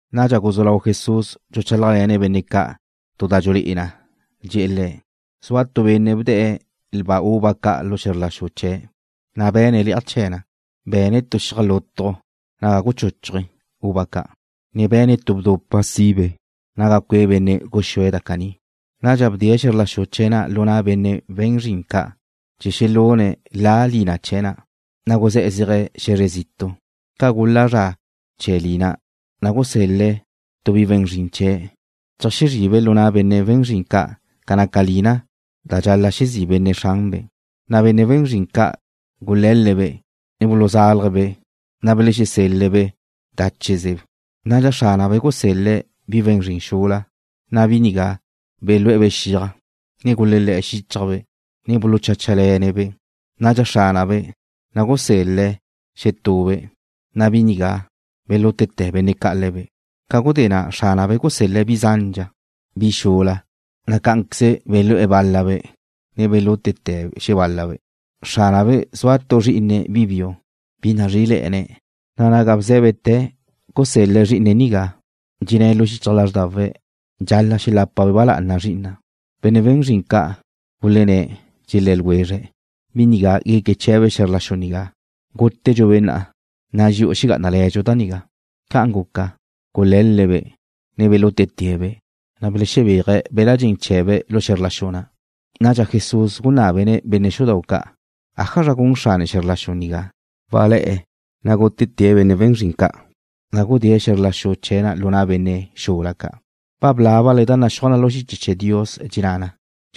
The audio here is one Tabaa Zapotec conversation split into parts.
Nadxa guzú lau Jesús dxuchálajle̱ne̱' benne' ca' tu da dxulé'e na. Dxe̱'e̱ le̱': ―Zua tu benne' bde̱'e̱ lba uva ca' lu xe̱zr la xu chee̱', na' be̱ne̱' le̱'aj chee̱ na. Be̱ne̱' tu xiaj lutju naga guchuchuje̱' uva ca', ne be̱ne̱' tu bdupa' naga cue' benne' guxúe̱' da caní. ’Nadxa bdee̱' xe̱zr la xu chee̱' na' lu na' benne' we̱n zrin ca' chee̱ xelune̱' la'a lina chee̱ na, na' guzé̱'e̱ zéaje̱' xe̱zre zitu'. Ca gula zra chee̱ lina, na' gusel-le̱' tu bi we̱n zrin chee̱' cheajxezri'ibe' lu na' benne' we̱n zrin ca' ca naca lina da dxal-la' xezí' benne' xranbe'. Na' benne' we̱n zrin ca' gule̱l-le̱'-be', ne buluzalje̱'-be', na' belexesel-le̱'-be' dáchezebe'. Nadxa xránabe' gusel-le̱' bi we̱n zrin xula, na' bi nigá belú'e̱-be' xiaj, ne gulelé̱'e̱ xíchajbe', ne bulucháchale̱ne̱'-be'. Na' xránabe' na' gusel-le̱' xetube', na' bi nigá belútete̱ benne' ca' le̱be'. Ca gudé na' xránabe' gusel-le̱' bi zandxa bi xula, na' cá'anqueze belú'e̱ bál-labe', ne belútete̱' xebál-labe'. ’Xránabe' zua tu zrí'ine̱' bi biu, bi nazrí'ile̱'e̱ne̱', na' naga bzé̱bete̱ gusel-le̱' zrí'ine̱' nigá, dxenné̱' lu xichaj lázrdawe̱': Dxal-la' xelape̱' ba lá'ana zri'ina'. Benne' we̱n zrin ca' gulenné̱', dxelé̱ ljwezre̱': “Bi nigá gueque chee̱be' xe̱zr la xu nigá. Gútete̱dxu-be' na'a, na' dxi'u xegá'anale̱dxu da nigá.” Ca'an guca, gule̱l-le̱'-be', ne belútete̱'-be', na' gulebéaje̱' be̱l-la' dxen chee̱be' lu xe̱zr la xu na'. Nadxa Jesús gunábene̱' benne' xudau' ca': ―¿Ájazra gun xrane xe̱zr la xu nigá? Walé̱'e̱, na' gútete̱' benne' we̱n zrin ca', na' gudée̱' xe̱zr la xu chee̱' lu na' benne' xula ca'. Ba blábale da naxúaj na lu xiche chee̱ Dios. Dxenná na: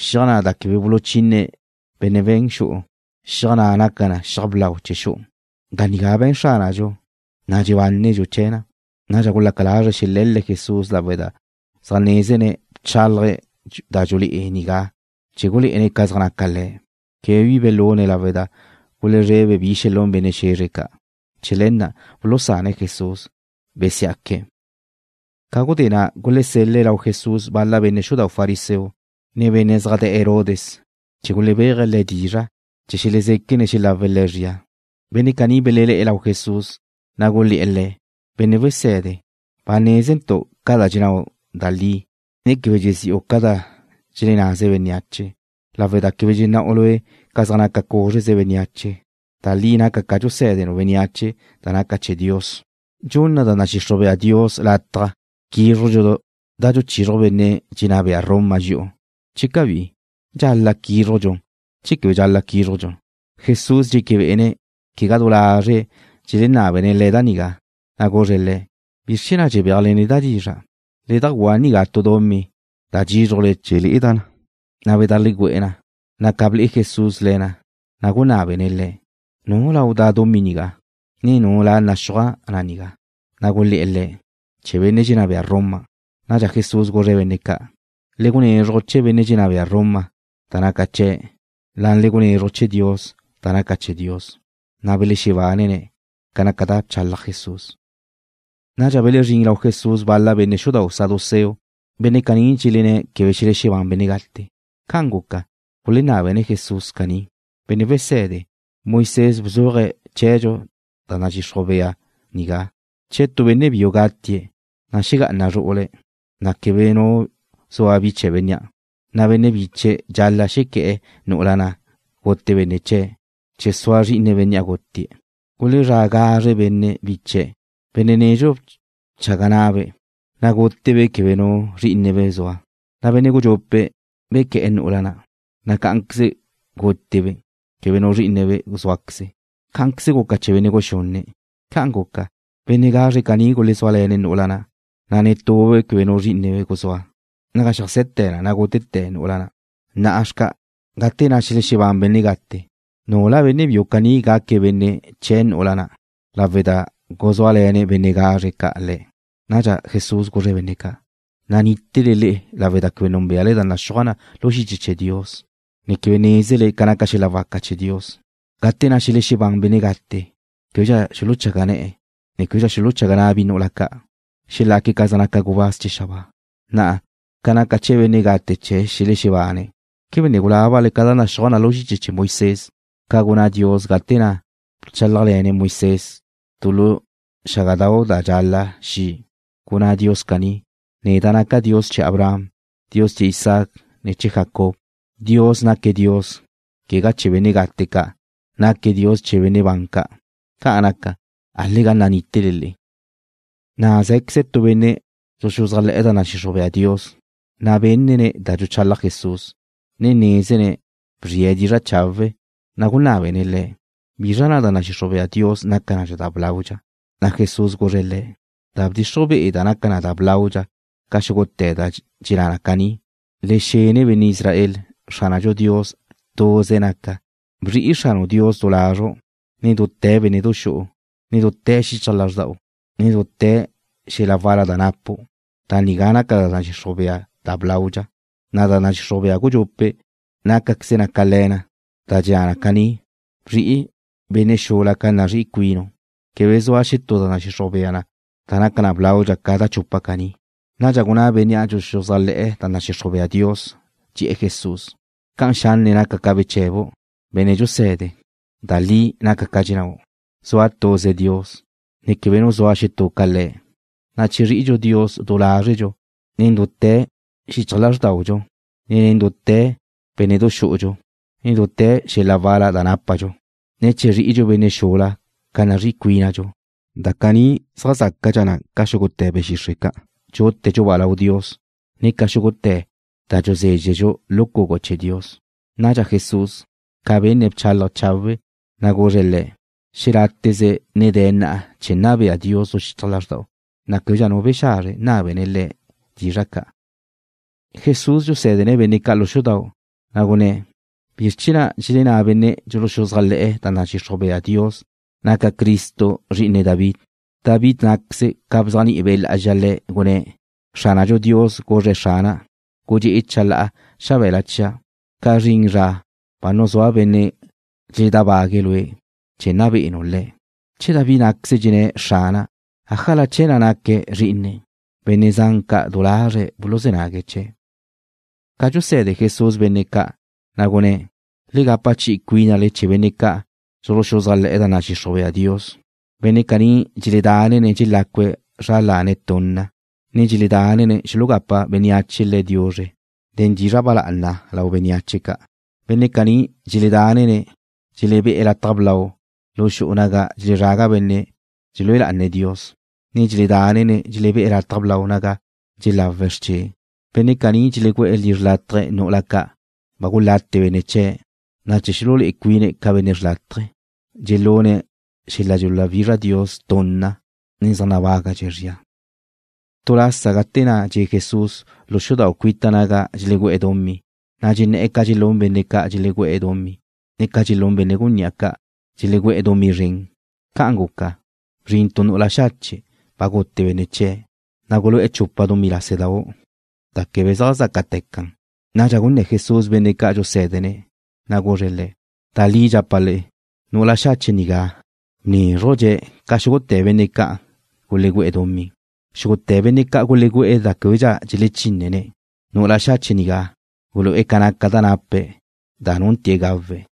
Xiaj na' da quebe buluchine benne' we̱n xu'u, xiaj na' naca na'a xiaj blau chee̱ xu'u. Da nigá be̱n Xránadxu, na' dxexebánedxu chee̱ na. Nadxa gulaca lazre̱' xele̱l-le̱' Jesús lawe' da zaj nézene̱' bchálaje̱' da dxulé'e nigá chee̱ gulé'ene̱' ca zaj naca le̱'. Quebe bi gulune̱' lawe' da gulezrebe̱' bi xelún benne' xe̱zre ca'. Chee̱ le̱ na' bulusane̱' Jesús, besí'aque̱'. Ca gudé na' gulesel-le̱' lau Jesús bal-la benne' xudau' fariseo, ne benne' zaj de̱'e̱ Herodes chee̱ gulebéaje̱' Le̱' dizra' chee̱ xelezéquene̱' xelawe̱' Le̱' zria. Benne' caní belelé̱'e̱ lau Jesús, na' gulé̱'e̱ Le̱': ―Benne' wese̱de, ba nézentu' ca dxennáu' da li, ne quebe dxezí'u ca da dxelennaze bénneache, lawe' da quebe dxenná'u Lue' ca zaj naca cúzreze bénneache. Da li naca ca dxusé̱denu' bénneache da naca chee̱ Dios. ¿Dxunna da nadxixruj bea Dios lataj quízrujdxu da dxuchizruj benne' dxenná bea Roma dxi'u, che cabí? ¿Dxal-la' quízrujdxu, che quebe quízrujdxu? Jesús dxéquebe'ene̱' quegá du lazre̱' dxelenábene̱' Le̱' da nigá, na' guzre̱' le̱': ―¿Bizr chee̱ na' dxebéajle neda' dizra'? Le dajguá nigá tu dumí da dxízrujle chee̱ le'eda' na. Na' bedajlegüé̱'e̱ na, na' ca ble'e Jesús le̱ na, na' gunábene̱' le̱': ―¿Nu lau da' dumí nigá, ne nu la naxúaj na nigá? Na' gulé̱'e̱ Le̱': ―Chee̱ benne' dxenná bea Roma. Nadxa Jesús guzre̱' benne' ca': ―Le gunezruj chee̱ benne' dxenná bea Roma da naca chee̱', na' le gunezruj chee̱ Dios da naca chee̱ Dios. Na' belexebánene̱' ca naca da bchalaj Jesús. Nadxa belezrín lau Jesús bal-la benne' xudau' saduceo. Benne' caní dxelenné̱' quebe xelexebán benne' gate. Ca'an guca, gulenábene̱' Jesús caní: ―Benne' wese̱de, Moisés bzuaje̱' chee̱dxu da nadxixruj bea nigá: “Che tu benne' biu gatie̱', ne xegá'ana zru'ule̱', na' quebe nu zua bi chee̱ bénnea', na' benne' biche̱' dxal-la' xequé̱'e̱ nu'ula na' gute benne' chee̱' chee̱ sua zri'ine bénnea' gutie̱'.” Gulezrá' gazre benne' biche̱'. Benne' nedxu bchaga na'abe', na' gútebe' quebe nu zrí'inebe' zua. Na' benne' gudxupe' bequé̱'e̱ nu'ula na', na' cá'anqueze gutie̱' quebe nu zrí'ine̱' zúaqueze. Cá'anqueze guca chee̱ benne' guxunne'. Ca'an guca, benne' gazre caní gulezúale̱ne̱' nu'ula na', na' netue̱' quebe nu zrí'ine̱' guzúa. Naga xeajse̱te̱ na gútete̱ nu'ula'. Na'a xca', gate na' xelexebán benne' gate, ¿nula benne' biu caní gaque̱' benne' chee̱ nu'ula na', lawe' da gulezúale̱ benne' gazre ca' le̱'? Nadxa Jesús guzre̱' benne' ca': ―Nanítele le'e lawe' da quebe núnbeale da naxúaj na lu xiche chee̱ Dios, ne quebe nézele ca naca xel-la waca chee̱ Dios. Gate na' xelexebán benne' gate, québedxa xuluchaga ne̱'e̱, ne québedxa xuluchaga na' bi nu'ula ca'. Xelaque̱' ca zaj naca gubáz chee̱ xabáa. Na'a, ca naca chee̱ benne' gate che xelexebane̱', ¿quebe ne gulábale ca da naxúaj na lu xiche chee̱ Moisés ca gunná Dios gate na' bchálajle̱ne̱' Moisés tu lu xágadau' da dxala xi'? Gunná Dios caní: “Neda' naca' Dios chee̱ Abraham, ne chee̱ Isaac, ne chee̱ Jacob.” Dios naque̱' Dios, quegá chee̱ benne' gate ca'. Naque̱' Dios chee̱ benne' ban ca'. Ca'an naca, álega nanítele le'e. Na' zé̱queze tu benne' dxuxuzájle̱'e̱ da nadxixruj bea Dios, na' benne̱' da dxuchalaj Jesús, ne nézene̱' bzri'e̱ dizra' chawe', na' gunábene̱' Le̱': ―¿Bizra da nadxixruj be'e Dios naca na da blaudxa? Na' Jesús guzre̱' le̱': ―Da bdxixruj be'e̱ da naca na da blaudxa ca xúgute̱ dxenná na caní: Le xene benne' Israel. Xránadxu Dios tuze naque̱'. Bzri'i Xranu' Dios du lazru', ne nen dute̱ bénne'du xu'u, ne nen dute̱ xichaj lázrda'u, ne nen dute̱ xel-la wal-la da napu'. Da nigá naca da nadxixruj bea da blaudxa, na' da nadxixruj bea gudxupe' nácaqueze na ca le̱ na, da dxenná na caní: Bzri'i benne' xula ca nazrí'i cuinu'. Quebe zua xetú da nadxixruj bea da naca blaudxa ca da chupa caní. Nadxa gunná bénnea' dxuxuzájle̱'e̱ da nadxixruj bea Dios, dxe̱'e̱ Jesús: ―Ca'an xanne naca ca beche̱bu', Benne' dxuse̱de. Da li naca ca dxennáu'. Zua tuze Dios, ne quebe nu zua xetú ca Le̱', na' che zri'idxu Dios du lázredxu, ne nen dute̱ xichaj lázrdaudxu, ne nen dute̱ bénne'du xú'udxu, ne nen dute̱ xel-la wal-la da nápadxu, ne che zri'idxu benne' xula ca nazrí'i cuínadxu, da caní zaj zácadxa na ca xúgute̱ be̱ xixre' ca' dxútedxu-ba' lau Dios, ne ca xúgute̱ da dxuzézxedxu lu cugu chee̱ Dios. Nadxa Jesús, ca benne̱' bchálaje̱' chawe', na' guzre̱' le̱': ―Xeláteze ne de̱ na chee̱ nna bea Dios xichaj lázrda'u. Na' québedxa nu bexazre nábene̱' Le̱' dizra' ca'. Jesús dxusé̱dene̱' benne' ca' lu xudau', na' gunné̱': ―¿Bizr chee̱ na' dxelenná benne' dxuluxuzájle̱'e̱ da nadxixruj bea Dios naca Cristo zri'ine David? David ná'queze ca bzéajni'i Be' Lá'azxa le̱', gunné̱': Xránadxu Dios guzre̱' Xrana': “Gudxé'e chalá'a xabe̱la chia', ca zrin zra ba nuzúa' benne' dxeledábague̱' lue', chee̱ na be'enu' le̱'.” Che David ná'queze dxenné̱': “Xrana'”, ¿ájala chee̱ na' naque̱' zrí'ine̱'? Benne' zan ca' du lazre̱' buluzé̱ nague̱' chee̱'. Ca dxuse̱de Jesús benne' ca', na' gunné̱': ―Le gapa chi'i cuínale chee̱ benne' ca'an dxuluxuzájle̱'e̱ da nadxixruj bea Dios. Benne' caní dxeledánene̱' dxelácue̱' zra lane̱' tunna, ne dxeledánene̱' xulugapa bénneache le̱' diuzre nen dizra' ba lá'ana lau bénneache ca'. Benne' caní dxeledánene̱' dxelebé'e̱ lataj blau lu xu'u naga dxelezraga benne' dxelúe lá'ane̱' Dios, ne dxeledánene̱' dxelebé'e̱ lataj blau naga dxelawe̱' xrche'. Benne' caní dxelegüe̱' lizre xrlataj nu'ula ca' ba gulate benne' chee̱', na' chee̱ xululé'e cuine̱' ca benne' xrlátaje, dxelune̱' xel-la dxuluwizraj Dios tunna. Le̱' zaj nabágadxe̱' zria. Tu lasa gate na' dxe' Jesús lu xudau' cuita naga dxelegú'e̱ dumí, na' dxenné̱'e̱ ca dxelún benne' ca' dxelegú'e̱ dumí, ne ca dxelún benne' gunní'a ca', dxelegú'e̱ dumí zren. Ca'an guca, bzrin tu nu'ula xache' ba gute benne' chie̱', na' gulu'e̱ chupa dumí lásedau' da quebe zaj zácate̱ can. Nadxa gunné̱ Jesús benne' ca'an dxusé̱dene̱', na' guzre̱' le̱': ―Da li dxapa' le'e, nu'ula xache' nigá bnézrujdxe̱' ca xúgute̱ benne' ca'an gulegú'e̱ dumí. Xúgute̱ benne' ca' gulegú'e̱ da québedxa dxelechínne̱'. Nu'ula xache' nigá gulu'e̱ ca naca da nape̱', da nunte̱ gawe̱'.